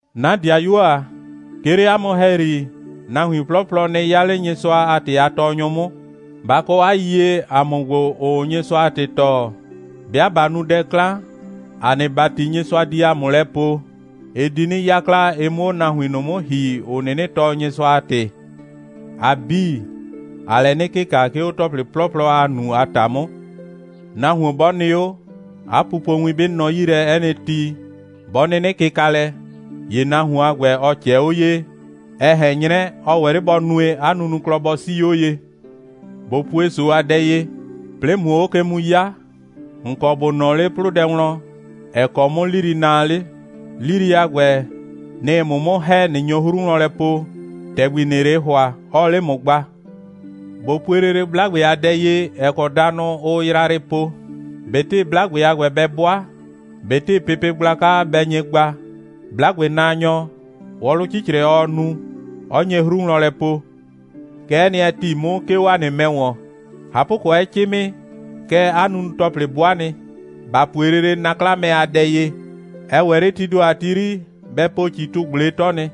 'Na ‑dɩayuo ‑a, 'ke 'le 'a mʋ ‑hɛyri, nahuin 'plɔplɔ nɩ 'ya 'le Nyɩsʋa a ‑tɩ a tɔɔnyʋ 'mʋ. Ba kɔ 'a yiyie, ‑a mʋ ‑gbo, ‑ʋʋ Nyɩsʋa a ‑tɩ tɔɔ, 'bɩa ꞊ba nu dɛ 'klan, ‑a nɩ ‑bati, Nyɩsʋa di ‑a mʋ lɛ poo, ɩ di 'nɩ 'yakla, ɩ 'mʋ 'o nahuin ꞊nʋ 'mʋ ‑hi, ‑ʋ 'nɩnɩ tɔɔ Nyɩsʋa a ‑tɩ. ‑A 'bii, ‑aa lɛ 'nɩ kɩka, 'ke 'o ‑tɔplɩ 'plɔplɔ, ‑aa nu a ‑ta 'mʋ. Nahuon 'bɔ nɩ 'o, 'a pupowin 'bɩ nɔ 'yi lɛ 'ɛ nɩ ti, 'bɔ 'nɩnɩ kɩka lɛ, ‑ye nahuon a ‑gbɛ, ɔ ꞊cɛɛ 'o ye, ɛ ꞊hɛn 'nyrɛ, ɔ ‑wɛ 'le ꞊le bɔ nue, 'a nunuklɔ 'bii bɔ 'sii 'o ye. ꞊Bo pue ‑so a dɛ ye. 'Plɩɩ ꞊muo 'o ke mu 'ya, ‑n kɔ ‑bo nɔɔ 'le 'plʋdɛ wlɔn, ‑ɛ kɔ 'mʋ 'lili naa 'le. 'Lili a ‑gbɛ, nɩ‑ɩ ‑mʋ 'mʋ ‑hɛ, ꞊nɩ nyo 'o 'hru wlɔn po, ‑tɛgbi ‑nɩɩ 'le ‑hʋa, ɔɔ 'le ‑mʋ gba. ꞊Bo pue lele 'blagbe a dɛ ye, ‑ɛ kɔ danʋ, ʋʋ yrayrɩ po. ꞊Betɩ 'blagbe a ‑gbɛ bɛ 'bʋa, ꞊betɩ pepe gblaka bɛ nye gba, 'blagbenaanyɔ, wɔlʋ 'cicrɛ ɔɔ nu, 'ɔ nye 'o 'hru wlɔn lɛ po. Kɛ'ɛ nɩ, ɛ ‑ti 'mʋ, 'ke 'o ‑a nɩ mɛ ‑wɔn. ꞊Hapʋkɔ, 'ɛ 'cɩmɩ, kɛɛ 'a nunu‑tɔplɩ 'bʋa nɩ. ‑Ba pue lele na'klamɛ a dɛ ye. Ɛ ‑wɛ 'le tii ‑do a ti 'yri bɛ po ‑citʋ꞊gble 'tɔ nɩ.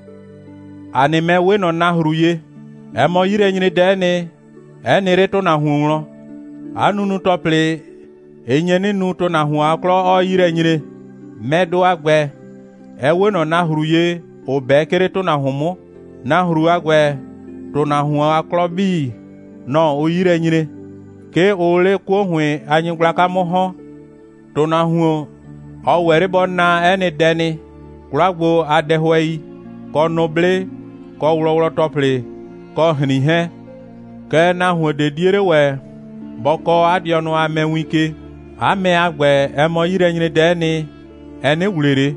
‑A nɩ mɛ 'we ꞊nɔ nahru ye. Ɛ mɔ 'yilɛnyredɛ'ɛ nɩ, 'ɛ nɩ 'le ‑tʋnahuon wlɔn. 'A nunu‑tɔplɩ, ɩ nye 'nɩ nu, ‑tʋnahuon a 'klɔ 'ɔɔ 'yi lɛ nyre. Mɛdʋ a ‑gbɛ, ɛ 'we ꞊nɔ nahru ye, ‑ʋ 'bɛ, 'ke 'le ‑tʋnahuon 'mʋ. Nahru a ‑gbɛ, ‑tʋnahuon a 'klɔ 'bii, nɔ‑ ʋʋ 'yi lɛ nyre. 'Ke ʋʋ 'le 'kuo ‑hʋɩn a nyɩgblaka 'mʋ ‑hɔn. ‑Tʋnahuon, ɔ ‑wɛ 'le bɔ naa 'ɛ nɩ dɛ nɩ: 'kwla gbo a dɛhʋɛi, kɔ nʋblɩ, kɔ wlɔwlɔ‑tɔplɩ, kɔ ‑hrin 'hɛɛn. Kɛɛ, nahuon ꞊de 'die 'le ‑wɛ bɔ kɔɔ 'a dɩɔnʋ a mɛ win ke. 'A mɛ a ‑gbɛ, ɛ mɔ 'yilɛnyredɛ'ɛ nɩ, ɛ 'nɩ ‑wle ꞊le.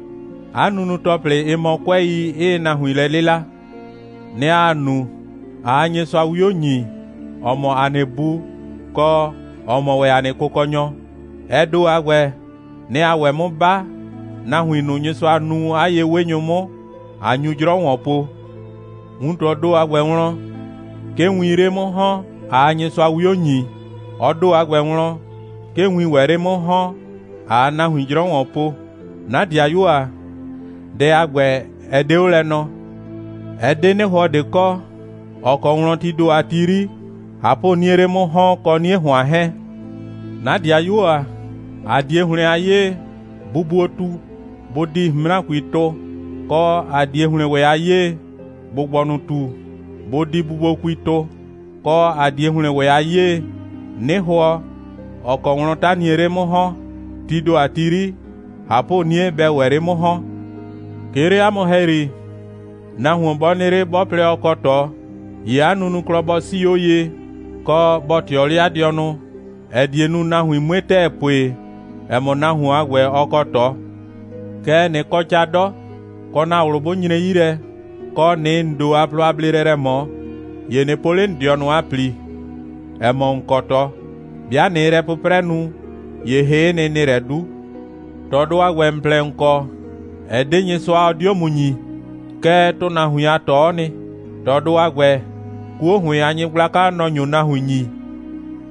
'A nunu‑tɔplɩ, ɩ mɔ 'kʋɛi, 'ɩɩ nahuin lɛ 'lɩla. Nɛ‑ ‑aa nu, ꞊aa Nyɩsʋa 'wio ‑nyi, ‑ɔ mɔ ‑a nɩ Bu, kɔ, ‑ɔ mɔ ‑wɛ ‑a nɩ Kʋkɔnyɔ. Ɛ ‑do a ‑gbɛ, nɛ‑ ‑aa ‑wɛ 'mʋ 'ba, nahuin ꞊nʋ, Nyɩsʋa nuu 'a ye'wenyʋ 'mʋ, ꞊a nyu 'jrɔ ‑wɔn po. Wuntɔɔ ‑do a ‑gbɛ wlɔn, 'ke wiin 'le 'mʋ ‑hɔn, ꞊aa Nyɩsʋa 'wio ‑nyi, ɔ ‑do a ‑gbɛ wlɔn, 'ke wiin ‑wɛ 'le 'mʋ ‑hɔn, ꞊aa nahuin 'jrɔ ‑wɔn po. 'Na ‑dɩayuo ‑a, dɛ a ‑gbɛ, ɛ 'de 'o lɛ nɔ. Ɛ 'de 'nɩhʋɔ ꞊de kɔ, ‑ɔ kɔ wlɔn, tii ‑do a ti 'yri, ꞊hapʋ'niee 'le 'mʋ ‑hɔn kɔ 'nie ‑hʋan 'hɛɛn. 'Na ‑dɩayuo ‑a, ‑a 'die ‑hlɩn a 'yee, bubuotu bʋ di ꞊hʋnmrakui tʋ, kɔ, ‑a 'die ‑hlɩn ‑wɛ a 'yee, ‑gbʋgbɔnʋtu bʋ di bubuokui tʋ, kɔ, ‑a 'die ‑hlɩn ‑wɛ a 'yee, 'nɩhʋɔ, ‑ɔ kɔ wlɔn 'taniee 'le 'mʋ ‑hɔn, tii ‑do a ti 'yri ꞊hapʋ'nie bɛɛ ‑wɛ 'le 'mʋ ‑hɔn. 'Ke 'le 'a mʋ ‑hɛyri, nahuon 'bɔ nɩ 'le, 'bɔ plɛ, ɔ kɔ ꞊tɔ, ‑ye 'a nunuklɔ bɔ 'sii 'o ye, kɔ, bɔ ꞊tɩɔ 'le 'a dɩɔnʋ, ‑ɛ die nu, nahuin 'mue ‑tɛɛ pue, ‑ɛ mɔ, nahuon a ‑gbɛ, ɔ kɔ ꞊tɔ. Kɛɛ, ꞊nɩ kɔ ca 'dɔ, kɔ, ‑na ꞊wlʋ 'bʋ nyre 'yi lɛ, kɔ, ꞊nɩɩ ‑n ‑do a plɔ a bleelɛ lɛ ꞊mɔ, ‑ye ꞊nɩ po 'le ‑n dɩɔnʋ a ‑pli, ‑ɛ mɔ, ‑n kɔ ꞊tɔ. 'Bɩa ꞊nɩɩ lɛ 'pʋprɛ nu, ‑ye hɩ'ɩ nɩ, ‑nɩɩ lɛ 'du. ꞊Tɔdʋ a ‑gbɛ, ‑n plɛ, ‑n kɔ, ɛ 'de Nyɩsʋa, ɔ 'dio ‑mʋ ‑nyi. Kɛɛ, ‑tʋnahuin a ꞊tɔ'ɔ nɩ. ꞊Tɔdʋ a ‑gbɛ, 'kuo ‑hʋɩn a nyɩgblaka, nɔ‑ nyo nahuin ‑nyi.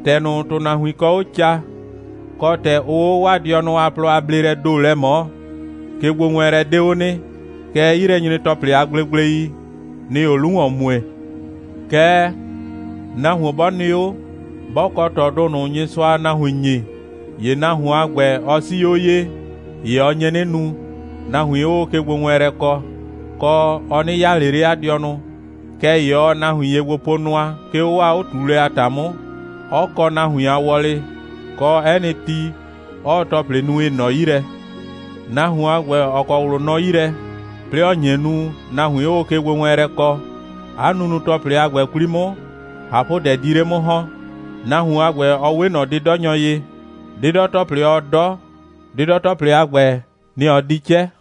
‑Tɛ ꞊nʋ, ‑tʋnahuin kɔ 'o ca, kɔ, ‑tɛ ʋʋ 'o 'waa dɩɔnʋ a plɔ a bleelɛɛ ‑do lɛ ꞊mɔɔ, kegbowɛɛnlɛ 'de 'o nɩ, kɛɛ, 'yilɛnyre‑tɔplɩ a gblegblei, nɩ‑ɩ 'o 'lu ‑wɔn mue. Kɛɛ, nahuon 'bɔ nɩ 'o, 'bɔ kɔ ꞊tɔdʋ ꞊nʋ, Nyɩsʋaa nahuin ‑nyi, ‑ye nahuon a ‑gbɛ, ɔ 'sii 'o ye, ‑ye ɔ nye 'nɩ nu, nahuin 'ʋʋ kegbowɛɛnlɛ kɔ, kɔ, ɔ 'nɩ 'yaa ꞊le 'le 'a dɩɔnʋ, kɛɛ ‑ye ɔɔ nahuin ye gbo po nʋa, 'ke 'o 'waa 'o꞊tuulɛ a ‑ta 'mʋ, 'ɔ kɔ nahuin a wɔlɩ, kɔ, 'ɛ nɩ ti, 'ɔɔ ‑tɔplɩ nu, ‑ɩ nɔ 'yi lɛ. Nahuon a ‑gbɛ, ‑ɔ kɔ ꞊wlʋ nɔ 'yi lɛ, 'plɩɩ ‑ɔ nye nu, nahuin 'ʋʋ kegbowɛɛnlɛ kɔ, 'a nunu‑tɔplɩ a ‑gbɛ 'kwli 'mʋ, ꞊hapʋdɛ di 'le 'mʋ ‑hɔn. Nahuon a ‑gbɛ, ɔ 'we ꞊nɔ 'dɩdɔnyɔ ye: 'dɩdɔ‑tɔplɩ, ɔɔ 'dɔ, 'dɩdɔ‑tɔplɩ a ‑gbɛ, nɩ‑ ɔ di 'cɛ.